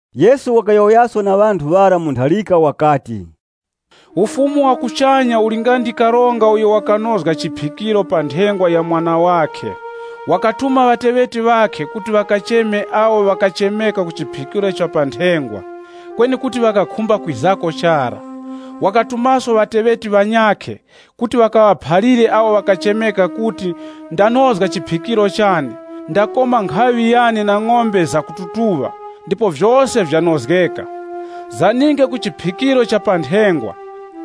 Yesu wakayowoyaso na ŵanthu ŵara mu ntharika wakati, “Ufumu wa kuchanya uli nga ndi karonga uyo wakanozga chiphikiro pa nthengwa ya mwana wakhe. Wakatuma ŵateŵeti ŵakhe kuti ŵakacheme awo ŵakachemeka ku chiphikiro cha nthengwa, kweni kuti ŵakakhumba kwizako chara. Wakatumaso ŵateŵeti ŵanyakhe kuti ŵakaŵaphalire awo ŵakachemeka kuti, ‘Ndanozga chiphikiro chane, ndakoma nkhaŵi yane na ng'ombe zakututuŵa, ndipo vyose vyanozgeka. Zaninge ku chiphikiro cha nthengwa!’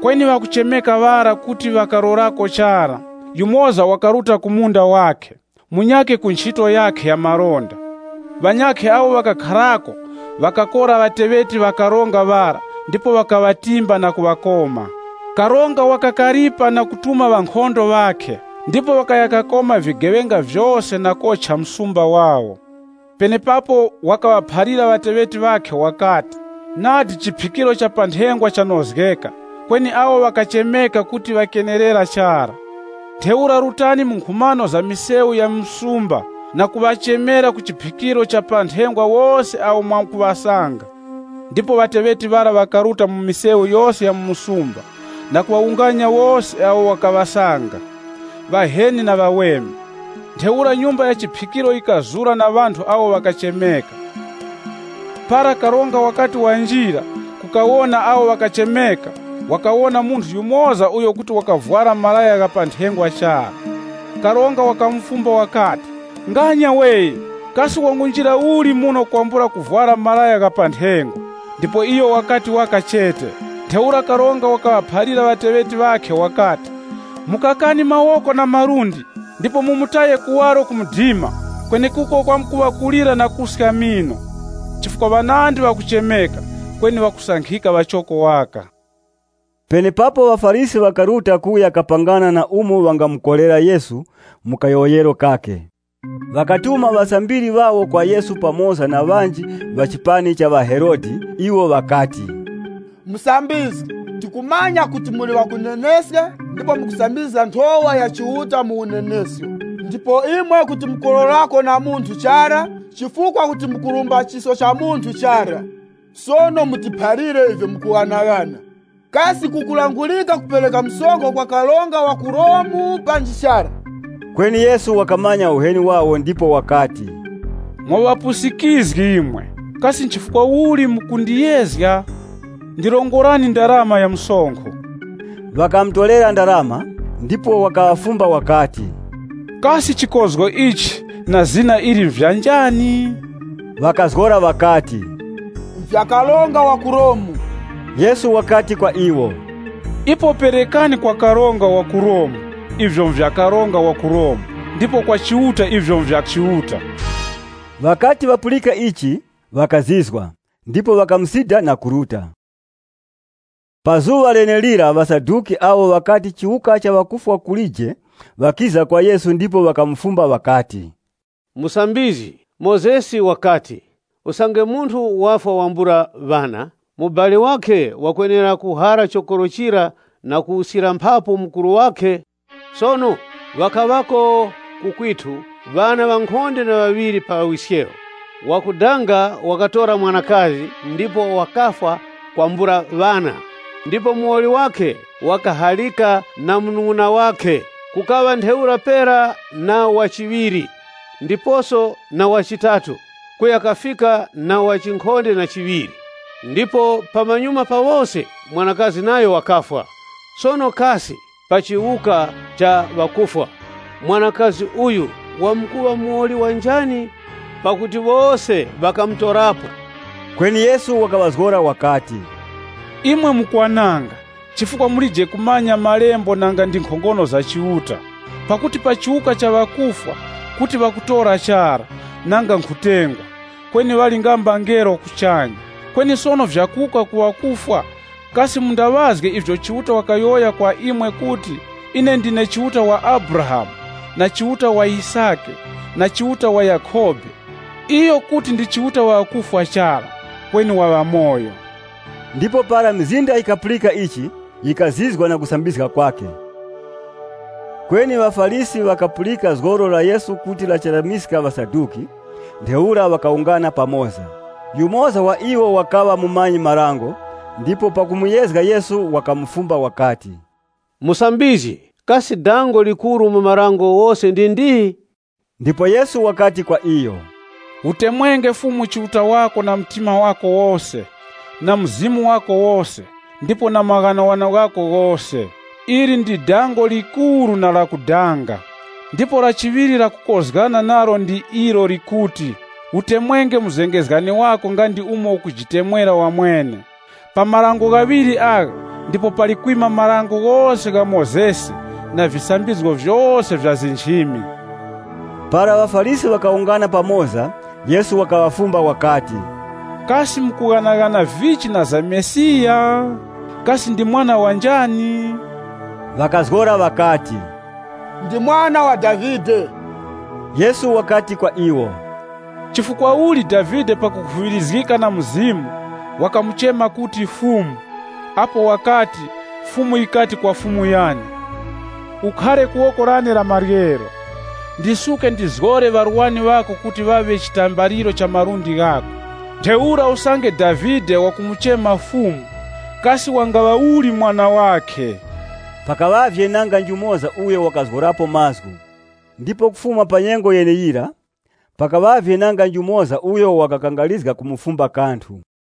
Kweni ŵakuchemeka ŵara kuti ŵakalorako chara, yumoza wakaruta ku munda wakhe, munyakhe ku nchito yakhe ya malonda. Ŵanyakhe awo ŵakakharako ŵakakora ŵateŵeti ŵa karonga yura ndipo ŵakaŵatimba na kuŵakoma. Karonga wakakaripa na kutuma ŵankhondo ŵakhe, ndipo ŵakaya kakoma vigeŵenga vyose na kocha msumba wawo. Penepapo wakaŵaphalira ŵateŵeti ŵakhe wakati, ‘Nadi chiphikiro cha nthengwa chanozgeka, kweni awo ŵakachemeka kuti ŵakenerera chara. Ntheura rutani mu nkhumano za misewu ya mu msumba na kuŵachemera ku chiphikiro ichi wose awo mwamkuŵasanga.’ Ndipo ŵateŵeti ŵara ŵakaruta mu misewu yose ya mu msumba na kuŵawunganya wose awo wakaŵasanga, ŵaheni na ŵaweme. Ntheura nyumba ya chiphikiro yikazura na ŵanthu awo ŵakachemeka. “Para karonga wakati wanjira kukawona awo ŵakachemeka, wakawona munthu yumoza uyo kuti wakavwara malaya gha pa nthengwa chara. Karonga wakamufumba wakati, ‘Nganya we! Kasi wangunjira uli muno kwambula kuvwara malaya gha pa nthengwa?’ Ndipo iyo wakati waka chete. Ntheura karonga wakaŵaphalira ŵateŵeti ŵakhe wakati, ‘Mukakani mawoko na malundi, ndipo mumutaye kuwaro ku mdima, kwenekuko kwamkuŵa kulira na kuska mino.’ “Chifukwa ŵanandi ŵakuchemeka, kweni ŵakusankhika ŵachoko waka.” Penepapo ŵaFarisi ŵakaruta kuya kapangana na umo ŵangamukorera Yesu mu kayowoyero kakhe. Ŵakatuma ŵasambiri ŵawo kwa Yesu pamoza na ŵanji ŵa chipani cha ŵaHerode. Iwo ŵakati, “Musambizgi, tikumanya kuti muli ŵakuneneska ndipo mukusambizga nthowa ya Chiuta mu unenesko, ndipo imwe kuti mukulorako na munthu chara, chifukwa kuti mukurumba chisko cha munthu chara. Sono mutiphalire ivyo mukughanaghana. Kasi kukulangurika kupereka msonkho kwa karonga wa ku Romu panji chara?” Kweni Yesu wakamanya uheni wawo, ndipo wakati, “Mwa ŵapusikizgi imwe, kasi chifukwa uli mukundiyezga? Ndirongorani ndarama ya msonkho.” Ŵakamutorera ndarama. Ndipo Yesu wakaŵafumba wakati, “Kasi chikozgo ichi na zina ili nvya njani?” Ŵakazgora ŵakati, “Nvya karonga wa ku Romu.” Yesu wakati kwa iwo, “Ipo perekani kwa karonga wa ku Romu ivyo nvya karonga wa ku Romu, ndipo kwa Chiuta ivyo nvya Chiuta.” Ŵakati ŵapulika ichi, ŵakazizwa, ndipo ŵakamusida na kuruta. Pa zuŵa lenelira ŵaSaduki, awo ŵakati chiwuka cha ŵakufwa kulije ŵakiza kwa Yesu ndipo ŵakamufumba ŵakati, “Musambizgi, Mozesi wakati, ‘Usange munthu wafwa wambula ŵana, mubali wakhe wakwenera kuhara chokoro chira na kuwuskira mphapu mukuru wakhe.’ Sono ŵakaŵako ku kwithu ŵana ŵankhonde na ŵaŵiri pa wiskewo. Wakudanga wakatora mwanakazi, ndipo wakafwa kwambula ŵana, ndipo muwoli wakhe wakaharika na munung'una wakhe. Kukaŵa ntheura pera na wa chiŵiri, ndiposo na wa chitatu, kuya kafika na ku wa chinkhonde na chiŵiri. Ndipo pamanyuma pa wose, mwanakazi nayo wakafwa. Sono kasi pa chiwuka cha ŵakufwa, mwanakazi uyu wamkuŵa muwoli wa njani pakuti wose ŵakamutorapo?” Kweni Yesu wakaŵazgora wakati, “Imwe mukwananga, chifukwa mulije kumanya malembo nanga ndi nkhongono za Chiuta. Pakuti mu chiwuka cha ŵakufwa, kuti ŵakutora chara, nanga nkhutengwa, kweni ŵali nga mbangelo kuchanya. Kweni sono vya kuwuka kwa ŵakufwa, kasi mundaŵazge ivyo Chiuta wakayowoya kwa imwe kuti, ‘Ine ndine Chiuta wa Abrahamu, na Chiuta wa Yisake, na Chiuta wa Yakhobe. Iyo kuti ndi Chiuta wa ŵakufwa chara, kweni wa ŵamoyo.’” Ndipo para mizinda yikapulika ichi, yikazizwa na kusambizga kwakhe. Kweni ŵaFarisi ŵakapulika zgoro la Yesu kuti lachetamiska ŵaSaduki, ŵakawungana pamoza. Yumoza wa iwo wakaŵa mumanyi-marango ndipo pakumuyezga Yesu wakamufumba wakati, “Musambizgi, kasi dango likuru mu marango ghose ndi ndi?” Ndipo Yesu wakati kwa iyo, “ ‘Utemwenge Fumu Chiuta wako na mtima wako wose, na mzimu wako wose, ndipo na vinjeru vyako vyose.’ Ili ndi dango likuru na lakudanga. Ndipo la chiŵiri lakukozgana nalo ndi ilo likuti, ‘Utemwenge muzengezgani wako nga ndi umo ukujitemwera wamwene.’ Pa marango ghaŵiri agha ndipo pali kwima Dango lose la Mozesi na visambizgo vyose vya nchimi.” Para ŵaFarisi ŵakawungana, Yesu wakaŵafumba wakati, “Kasi mukughanaghana vichi na za Mesiya? Kasi ndi Mwana wa njani?” Ŵakazgora ŵakati, “Ndi Mwana wa Davide.” Yesu wakati kwa iwo, “Chifukwa uli Davide pakukhuŵirizgika na Mzimu, wakamuchema kuti, ‘Fumu’, apo wakati, Fumu yikati kwa Fumu yane, ‘Ukhare ku woko lane la maryero, ndisuke ndizgore ŵarwani ŵako kuŵa chitambaliro cha malundi ghako.’ Ntheura usange Davide wakumuchema, ‘Fumu’, kasi wangaŵa uli mwana wakhe?” Pakaŵavye nanga njumoza uyo wakazgorapo mazgu, ndipo kufuma pa nyengo yeneyira, pakaŵavye nanga njumoza uyo wakakangarizga kumufumba kanthu.